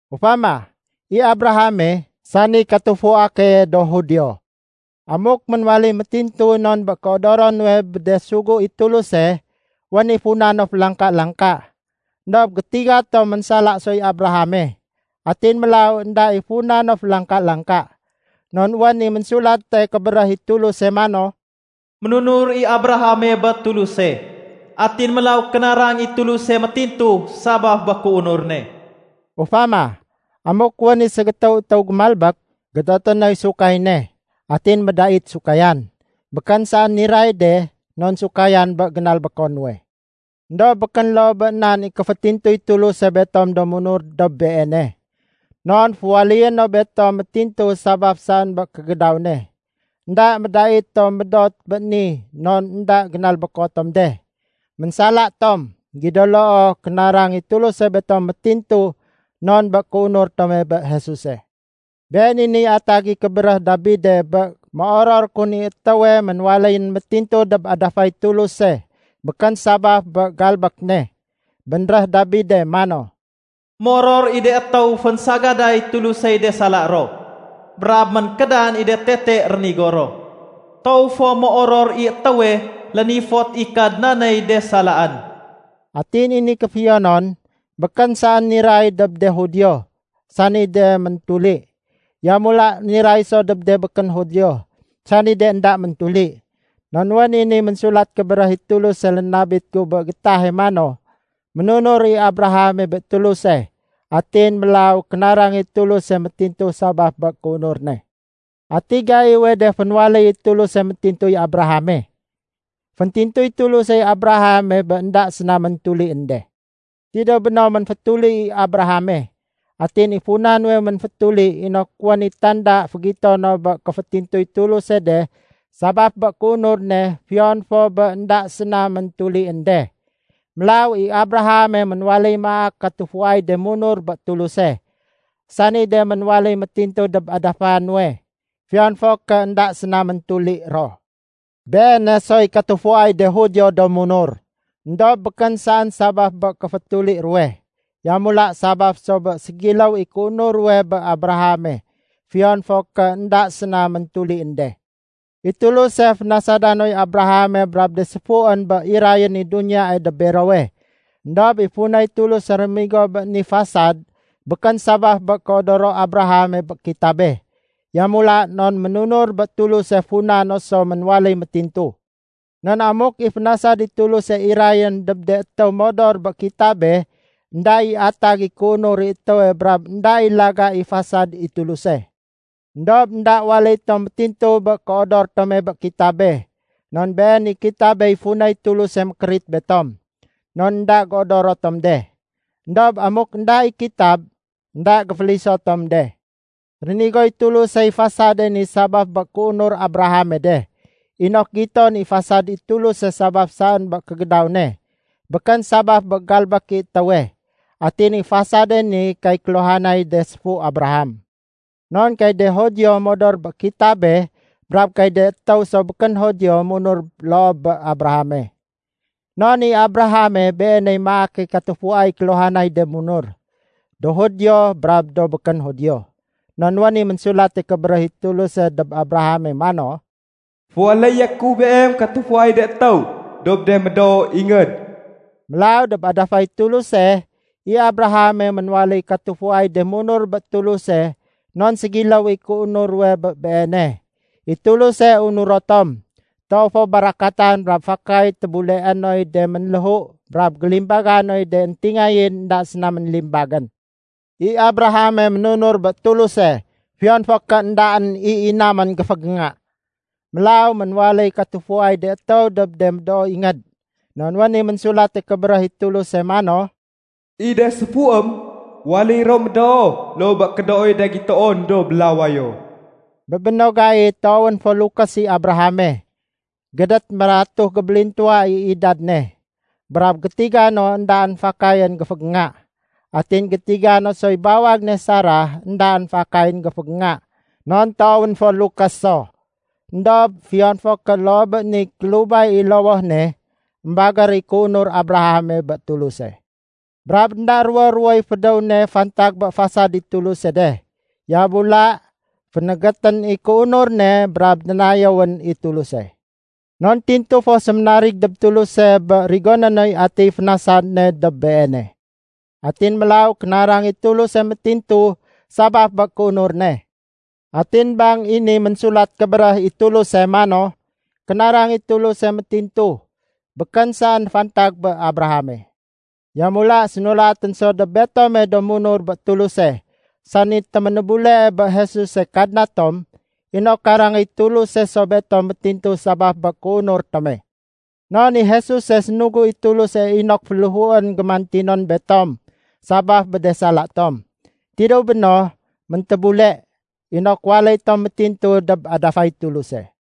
Ufama, i Abrahame, sani katufua keye do Judio. Amuk ménwaléy métintu non bé kéodoro nuwe bé de sugu i Tuluse, wén i funa no félangka-langka. Endob gétiga tom ménsala soy Abrahame, atin mélaw énda i funa no félangka-langka. Non wén i Ménsulate Kébéréh i Tuluse mano, “Ménunur i Abrahame bé Tuluse. Atin mélaw kénarang i Tuluse métintu sabaf bé kéunur ne.” Ufama, amuk wén i ségétéw étéw géménalbék, gédoté noy sahud ne. Atin médait sémahud. Békén saén niray de non sahudén bé génalbéko nuwe. Endob békén loo bé nan i kéfétintuy Tuluse betom do munur dob Beene. Non féwaléyé no betom métintu sabaf saén bé kégédaw ne. Enda médait tom médot bé ni non énda génalbéko tom de. Ménsala tom, gido loo kénarang i Tuluse betom métintu non bé kéunur tome bé Jesuse. Been i niy atag i kébéréh Dabide bé méoror kun i étéwe ménwaléyén métintu dob adafay Tuluse békén sabaf bé galbék ne. Bénréh Dabide mano, “Méoror i de étéw fénsagaday Tulusey de sala ro brab ménkédan i de tete rénigo ro. Toow fo méoror i étéwe lénifot i Kadnaney de salaén.” Atin i ni kéfiyonon, békén saén niray dob de Judio, sani de méntuli. Yamula niray so dob de békén Judio, sani de énda méntuli. Non wén i ni Ménsulat Kébéréh i Tuluse lénabit gu bé gétahe mano, “Ménunur i Abrahame bé Tuluse, atin mélaw kénarang i Tuluse métintu sabaf bé kéunur ne.” Ati gaiwe de fénwaléy i Tuluse métintuy Abrahame? Féntintuy Tulusey Abrahame bé énda séna méntulién de. Tidéw béno, ménfétuli i Abrahame. Atin i funa nuwe ménfétuli inok wén i tanda fégito no bé kéfétintuy Tuluse de sabaf bé kéunur ne fiyon fo bé énda séna méntulién de. Mélaw i Abrahame ménwaléy maak katufuay de munur bé Tuluse, sani de ménwaléy métintu dob adafa nuwe, fiyon fo ké énda séna méntuli ro. Beene soy katufuay de Judio do munur, éndob békén saén sabaf bé kéfétuli ruwe. Yamula sabaf so bé ségiléw i kéunur ruwe bé Abrahame fiyon fo ké énda séna méntulién de. I Tuluse fénasada noy Abrahame brab de séfuén bé irayén i duniyae dob berowe. Endob i funay Tuluse réménigo bé ni fasad békén sabaf bé kéodoro Abrahame bé kitabe. Yamula non ménunur bé Tuluse funa no so ménwaléy métintu. Non amuk i fénasad i Tuluse irayén dob de étéw modor bé kitabe, énda i atag i kéunur i étéwe brab énda i laga i fasad i Tuluse. Endob énda waléy tom métintu bé kéodor tome bé kitabe, non been i kitabey funay Tuluse mékérit betom. Non énda géodoro tom de. Endob amuk énda i kitab, énda géféliso tom de. Rénigoy Tulusey fasad ne sabaf bé kéunur Abrahame de, inok giton i fasad i Tuluse sabaf saén bé kégédaw ne, békén sabaf bé galbék i étéwe. Atin i fasade ni kay kéluhanay de séfu Abraham. Non kay de Judio modor bé kitabe brab kay de étéw so békén Judio munur loo bé Abrahame. Non i Abrahame, beeney maake katufuay kéluhanay de munur, do Judio brab de békén Judio. Non wén i Ménsulate Kébéréh i Tuluse dob Abrahame mano, “Féwaléyé ku beem katufuay de étéw dob de médoo ingéd.” Mélaw dob adafay Tuluse, i Abrahame ménwaléy katufuay de munur bé Tuluse non ségiléw i kéunur ruwe bé beene. I Tuluse unuro tom, toow fo barakatan brab fakay tébuleé noy de ménléhu brab gélimbaga noy de éntingayén énda séna ménlimbagén. I Abrahame ménunur bé Tuluse fiyon fo ké éndaén i inamén géfégénga. Mélaw ménwaléy katufuay de étéw dob de médoo ingéd. Non wén i Ménsulate Kébéréh i Tuluse mano, “I de séfuém waléy ro médoo loo bé kédooy de gitoon dob lawayo.” Bé béno gai toowén fo lukés i Abrahame, gédét mératuh gébélintuwa i idad ne, brab gétiga no éndaén fakayén géfégénga. Atin gétiga no soy bawag ne Sarah éndaén fakayén géfégénga non toowén fo lukés so. Endob fiyon fo ké loo bé niy kélubay i lowoh ne, émbagér i kéunur Abrahame bé Tuluse. Brab énda ruwo-ruwoy fédéw ne fantag bé fasad i Tuluse de, yamula fénégétén i kéunur ne brab dénayéwén i Tuluse. Non tintu fo séménarig dob Tuluse bé rigoné noy atiy fénasad ne dob beene. Atin mélaw kénarang i Tuluse métintu sabaf bé kéunur ne. Atin bang i ni Ménsulat Kébéréh i Tuluse mano, “Kénarang i Tuluse métintu” békén saén fantag bé Abrahame. Yamula sénulatén so dob betome do munur bé Tuluse, sani téménébulee bé Jesuse Kadna tom, inok karangéy Tuluse so betom métintu sabaf bé kéunur tome. Non i Jesuse sénugu i Tuluse inok féléhuén gémantinon betom sabaf bé de sala tom. Tidéw béno, méntébule, inok waléy tom métintu dob adafay Tuluse.